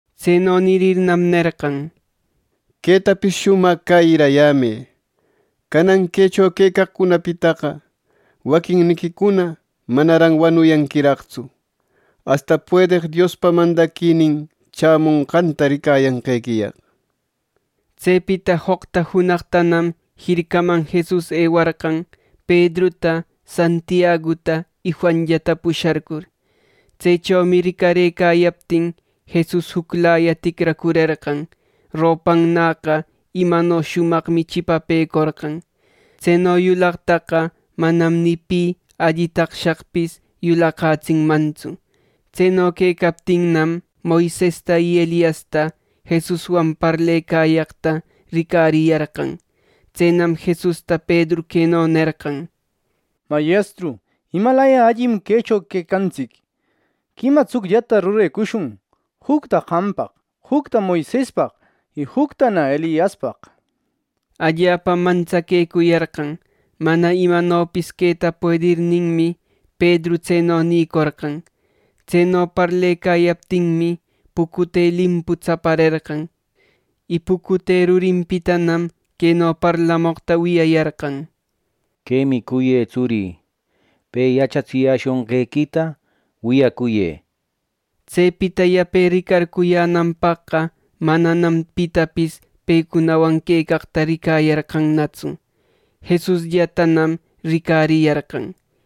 Tseno nirirnam, nerqan: —Quetapis shumaq cäyirayämë: Canan quecho quecaqcunapitaqa waquinniquicuna manaran wanuyanquiraqtsu, asta puedeq Diospa mandaquinin chämushqanta ricayanqequiyaq. Tsepita joqta junaqtanam jircaman Jesus ewarqan Pedruta, Santiaguta, y Juanllata pusharcur. Tsechomi ricarëcayaptin, Jesus juclaya ticracurerqan. Ropannäqa imano shumaqmi chipapecorqan. Tseno yulaqtaqa manam ni pi alli taqshaqpis yulaqätsinmantsu. Tseno quecaptinnam, Moisesta y Eliasta Jesuswan parlecayaqta ricariyarqan. Tsenam Jesusta Pedru queno nerqan: —Mayestru, ¡imalaya allim quecho quecantsic! ¡Quima tsucllata rurecushun: jucta qampaq, jucta Moisespaq y juctana Eliaspaq! —nir. Allapam mantsaquecuyarqan. Mana imanopis queta puedirninmi, Pedru tseno nïcorqan. Tseno parlecayaptinmi, pucute limpu tsapärerqan. Y pucute rurinpitanam queno parlamoqta wiyayarqan: —Quemi cuyë tsurï. Pe yachatsiyäshunqequita wiyacuyë —neqta. Tsepita yape ricarcuyänanpaqqa mananam pitapis pecunawan quecaqta ricayarqanatsu. Jesusllatanam ricariyarqan.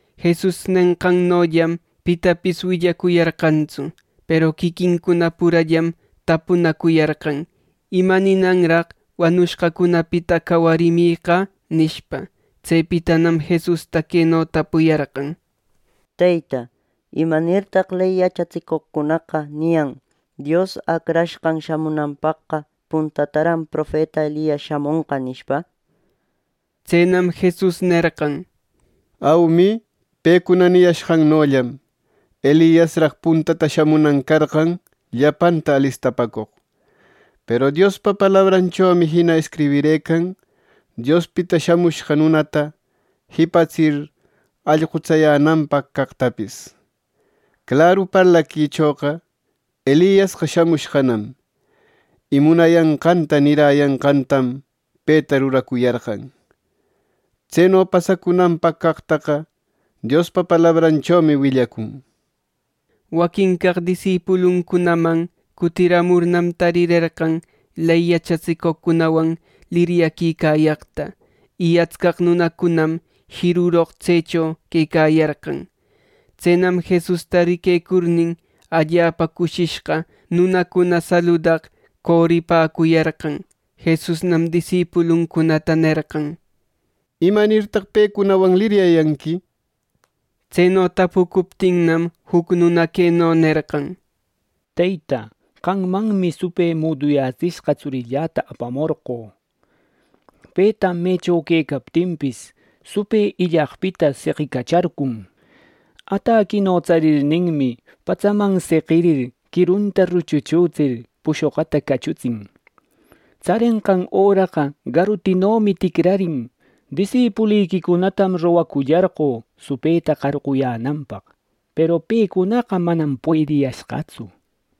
Jesus nenqannollam pitapis willacuyarqantsu. Peru quiquincuna purallam tapunacuyarqan, “¿Ima ninanraq wanushqacunapita cawarimiqa?” nishpa. Tsepitanam Jesusta queno tapuyarqan: —Teyta, ¿Imanirtaq ley yachatsicoqcunaqa niyan Dios Acrashqan shamunanpaqqa puntataran profeta Elias shamonqa nishpa? Tsenam Jesus nerqan: —Aumi, pecuna niyashqannollam Eliasraq puntata shamunan carqan llapanta alistapäcoq. Peru Diospa palabranchomi jina escribirëcan Diospita Shamushqa Nunata jipatsir allqutsayänanpaq caqtapis. Claru parlaquichoqa Eliasqa shamushqanam y munayanqanta niräyanqantam peta ruracuyarqan. Tseno pasacunanpaq caqtaqa Diospa palabranchomi willacun. Waquin caq disipuluncunaman cutiramurnam, tarirerqan ley yachatsicoqcunawan liryaquicayaqta. Y astcaq nunacunam jiruroq tsecho quecayarqan. Tsenam Jesusta riquecurnin, allapa cushishqa nunacuna saludaq coripäcuyarqan. Jesusnam disipuluncunata nerqan: —¿Imanirtaq pecunawan liryayanqui? Tseno tapucuptinnam, juc nuna queno nerqan: —Teyta, qammanmi supë muduyätsishqa tsurïllata apamorqö. Petam mecho quecaptinpis, supë illaqpita seqicacharcun. Ataquino tsarirninmi, patsaman seqirir, quirunta ruchuchütsir, pushoquta cachutsin. Tsarenqan öranäqa garutinomi ticrarin. Disipuliquicunatam rogacullarqö supëta qarquyänanpaq, peru pecunaqa manam puediyashqatsu.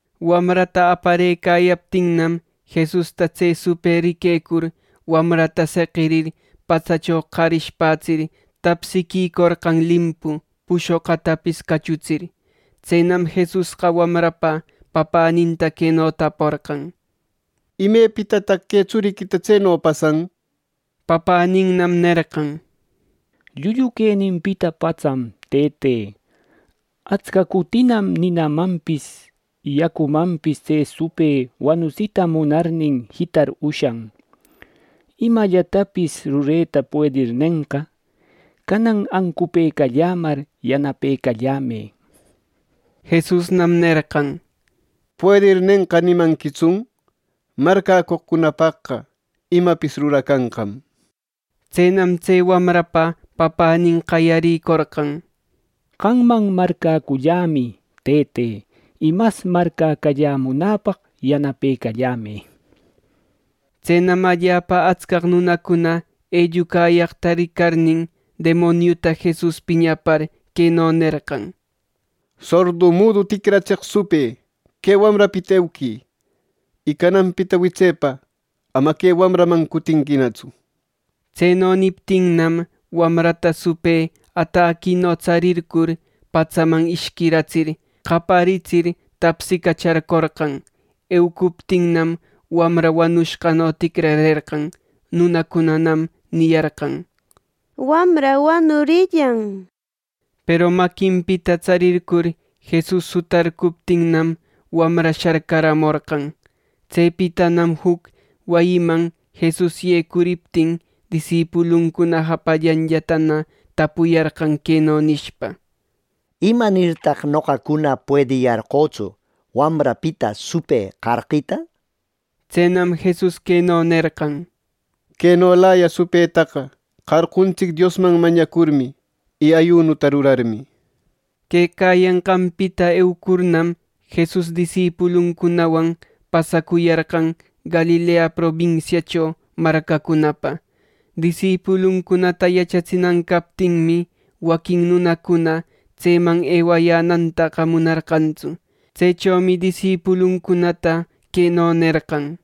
Wamrata aparëcayaptinnam, Jesusta tse supë riquecur wamrata seqirir patsacho qarishpätsir tapsiquicorqan limpu pushoqutapis cachutsir. Tsenam Jesusqa wamrapa papäninta queno taporqan: —¿Imepitataq que tsuriquita tseno pasan? —nir. Papäninnam nerqan: —Llullu queninpita patsam, Tëte. Atsca cutinam ninamanpis, yacumanpis tse supë wanutsita munarnin jitar ushan. Imallatapis rureta puedirnenqa, canan ancupëcallämar yanapecalläyämë —nir. Jesusnam nerqan: —¿Puedirnenqa nimanquitsun? ¡Marcäcoqcunapaqqa imapis ruracanqam! Tsenam tse wamrapa papänin qayarïcorqan: —Qamman marcäcullämi, Tëte, y mas marcäcallämunäpaq yanapecallämë —nir. Tsenam allapa atscaq nunacuna ellucayaqta ricarnin, demoniuta Jesus piñapar queno nerqan: —Sordu mudu ticratseq supë que wamrapita euquï, y cananpita witsepa ama que wamraman cutinquinatsu —nir. Tseno niptinnam, wamrata supë ataquino tsarircur, patsaman ishquiratsir, qayaritsir, tapsicacharcorqan. Eucuptinnam, wamra wanushqano ticrarerqan. Nunacunanam niyarqan: —Wamra wanurillan —nir. Peru maquinpita tsarircur Jesus sutarcuptinnam, wamra sharcaramorqan. Tsepitanam juc wayiman Jesus yecuriptin disipuluncuna japallanllatana tapuyarqan queno nishpa: —¿Imanirtaq noqacuna puediyarqötsu wamrapita supë qarqita? —nir. Tsenam Jesus queno nerqan: —Quenolaya supëtaqa qarquntsic Diosman mañacurmi y ˻ayunuta rurarmi˼ —nir. Quecayanqanpita eucurnam, Jesus disipuluncunawan pasacuyarqan Galilea probinsiacho marcacunapa. Disipuluncunata yachatsinan captinmi, waquin nunacuna tseman ewayänantaqa munarqantsu. Tsechomi disipuluncunata queno nerqan: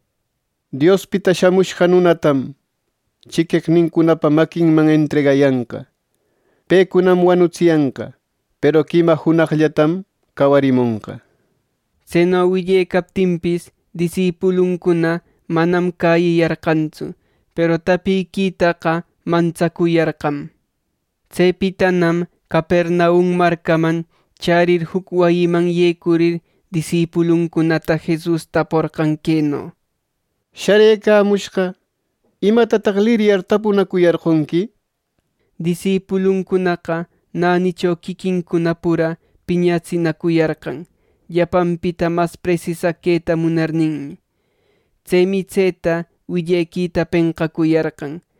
—Diospita Shamushqa Nunatam chiqueqnincunapa maquinman entregayanqa. Pecunam wanutsiyanqa; peru quima junaqllatam cawarimonqa. Tseno willecaptinpis, disipuluncuna manam cäyiyarqantsu, peru tapiquitaqa mantsacuyarqam. Tsepitanam Capernaum marcaman chärir juc wayiman yecurir disipuluncunata Jesus taporqan queno: —Sharëcamushqa ¿imatataq liryar tapunacuyarqonqui? Disipuluncunaqa nänicho quiquincuna pura piñatsinacuyarqan, llapanpita mas presisaq queta munarninmi. Tsemi tseta willequita penqacuyarqan.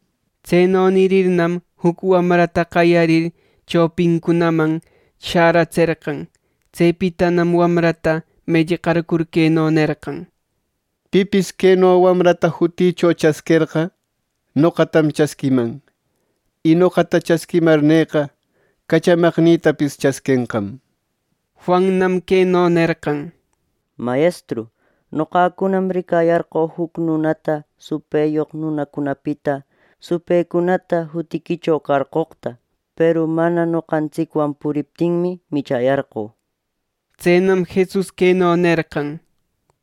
Tseno nirirnam, juc wamrata qayarir chopincunaman shäratserqan. Tsepitanam wamrata mellqarcur, queno nerqan: —Pipis queno wamrata jutïcho chasquerqa, noqatam chasquiman; y noqata chasquimarneqa, cachamaqnïtapis chasquenqam. Juannam queno nerqan: —Mayestru, noqacunam ricayarqö juc nunata supëyoq nunacunapita supëcunata jutiquicho qarqoqta. Peru mana noqantsicwan puriptinmi, michäyarqö. Tsenam Jesus queno nerqan: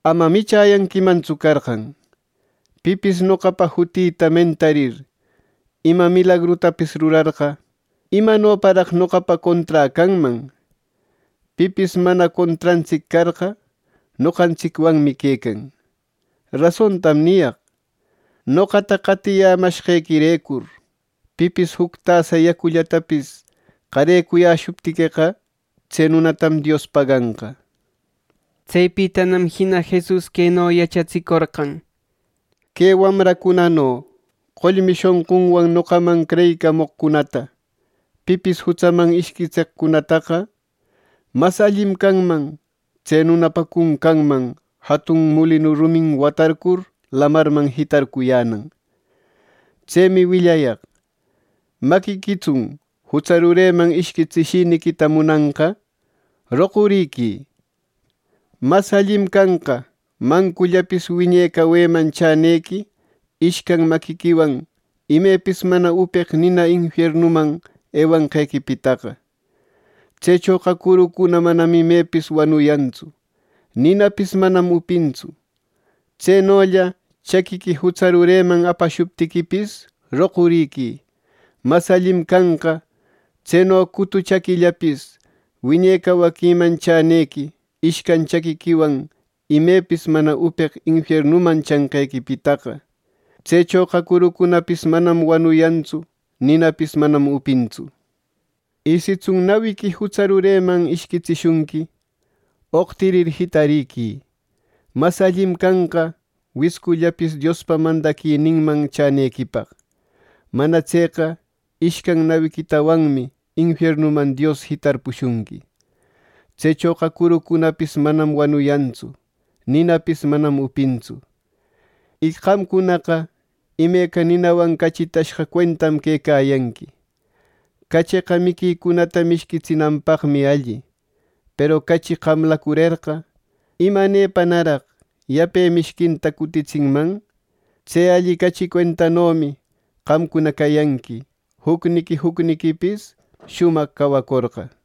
—Ama michäyanquimantsu carqan. Pipis noqapa jutïta mentarir ima milagrutapis rurarqa ¿imanoparaq noqapa conträ canman? Pipis mana contrantsic carqa, noqantsicwanmi quecan. Rasontam niyaq: Noqata qatiyämashqequirecur pipis juc tasa yacullatapis qarecuyäshuptiqueqa, tse nunatam Dios paganqa. Tsepitanam jina Jesus queno yachatsicorqan: “Que wamracunano qollmi shonqunwan noqaman creyicamoqcunata pipis jutsaman ishquitseqcunataqa; mas allim canman tse nunapa cuncanman jatun mulinu rumin watarcur lamarman jitarcuyänan. Tsemi willayaq: Maquiquitsun jutsa rureman ishquitsishiniquita munanqa, roquriquï. Mas allim canqa mancullapis wiñe caweman chäyänequi, ishcan maquiquiwan imepis mana upeq nina infiernuman ewanqequipitaqa. ˻Tsechoqa curucuna manam imepis wanuyantsu. Ninapis manam upintsu.˼ Tsenolla chaquiqui jutsa rureman apashuptiquipis roquriquï. Mas allim canqa tseno cutu chaquillapis wiñe cawaquiman chänequi ishcan chaquiquiwan imepis mana upeq infiernuman chanqequipitaqa. ˻Tsechoqa curuncunapis manam wanuyantsu. Ninapis manam upintsu.˼ Y sitsun nawiqui jutsa rureman ishquitsishunqui, oqtirir jitariquï. Mas allim canqa wiscullapis Diospa mandaquininman chänequipaq. Mana tseqa ishcan nawiquitawanmi infiernuman Dios jitarpushunqui. Tsechoqa curucunapis manam wanuyantsu. Ninapis manam upintsu. “Y qamcunaqa imeca ninawan cachitashqa cuentam quecayanqui. Cacheqa miquicunata mishquitsinanpaqmi alli. Peru cachi qamläcurerqa, ¿imanepanaraq yape mishquinta cutitsinman? Tse alli cachi cuentanomi qamcuna cayanqui, jucniqui jucniquipis shumaq cawacorqa.”